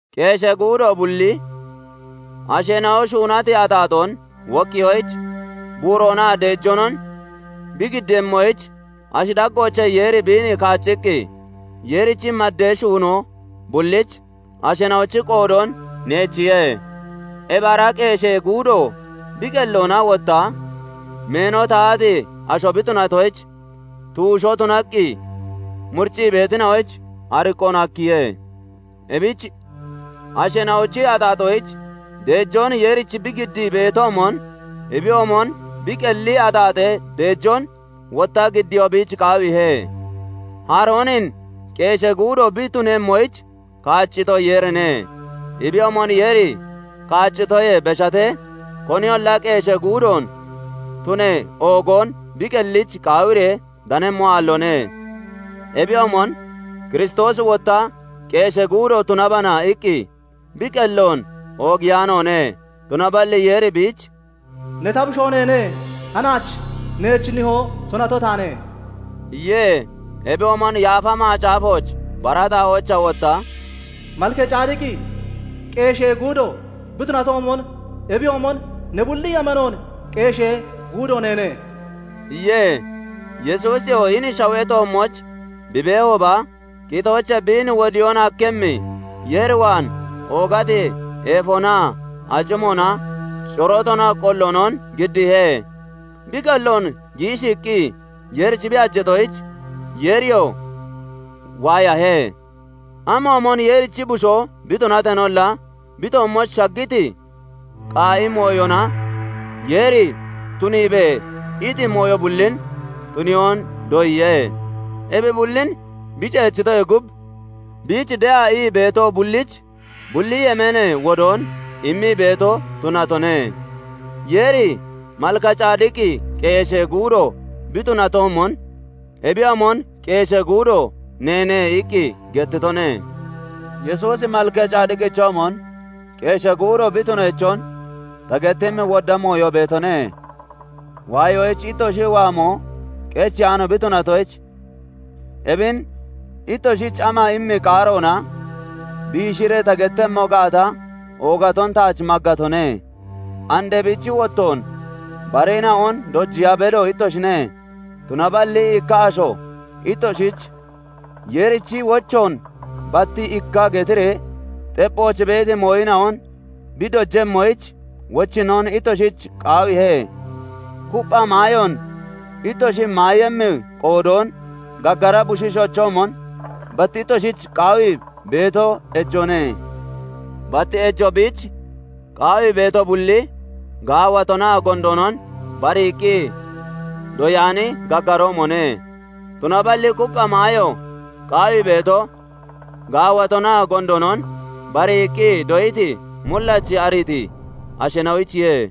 Qeeshee guudo bulli, asheena'o shuunati axaaxoon wokkiyoyich buuroonaa deejoonon bi giddiiyemmoyich, ashi daggoochee Yeeri biin kaacciqqi, Yeerichi maddee shuunoo bullich asheena'ochi qoodoon neechiye. Ebi ara qeeshee guudo bi qelloona wotta meeno tahati asho bi tunatoyich, tuushoo tunaqqi muriccii beetina'oyich ariqqoon hakkiye. Ebich asheena'ochi axaaxoyich deejoon Yeerich bi giddii beetoomon, ebiyoomon bi qelli axaaxee deejoon wotta giddiyoo biich qaawiihe. Haroonin qeeshee guudo bi tunemmoyich kaaccito, Yeerine; ebiyoomon Yeeri kaaccitoyee beshatee, koniyolla qeeshee guudoon tunee oogoon bi qellich qaawiree danemmo aalloone. Ebiyoomon Kiristoosi wotta "Qeeshee guudo tunabana" iqqi bi qelloon oogiyaanoone; tunaballi Yeeri biich "Ne ta Bushoo neene; hanaach neech Nihoo tunato taane" iye. Ebiyoomon Yaafa Macaafooch bara xaa'oochaa wotta "Malkacadiqi qeeshee guudo bi tunatoomon, Ebiyoomon ne bulli yemeenoon qeeshee guudo neene" iye. Yesuusiyoo hini shawee toommooch bi beehooba, qitoochee biin wodiyoon hakkemmi Yeer waan oogati eefonaa acimoona corootoonaa qolloonon giddiihe; bi qelloon giishiiqqi Yeerich bi hajeetoyich, Yeeriyoo waayahe. Amoomon Yeerichi Bushoo bi tunateenolla, bi toommooch shaggiti qaa'i mooyona Yeeri "Tuniibe!" iti mooyo bullin tuniyoon doyiye. Ebi bullin bi ceechitoyee gub, biich de'a ii beeto bullich bulli yemeenee wodoon immii beeto tunatone. Yeeri "Malkacadiqi qeeshee guudo bi tunatoomon, ebiyoomon qeeshee guudo neene" iqqi gettitone. Yesuusi Malkacadiqichoomon qeeshee guudo bi tuneechon ta gettemmi wodda mooyo beetone. Waayoyich ittoshi waamo qecheyaano bi tunatoyich, ebin ittoshich ama immi qaaroona biishiree ta gettemmo gaata oogaton taach maggatone. And ebichi wottoon bareena'on dojiya bedo ittoshine; tunaballi ikka asho ittoshich Yeerichi wochoon bat ikka getiree xepphooch beeti mooyina'on bi dojemmoyich wochinnoon ittoshich qaawiihe. Kuppha maayoon ittoshi maayemmi qoodoon gaggara bushiishoochoomon bat ittoshich qawii beeto ejoone. Bat ejo biich qaawii beeto bulli gaawatonaa gondoonon bariiqqi doyaani gaggaroomone; tunaballi kuppha maayo qaawii beeto, gaawatonaa gondoonon bariiqqi doyiti, mullachi, ariiti asheena'oyichiye.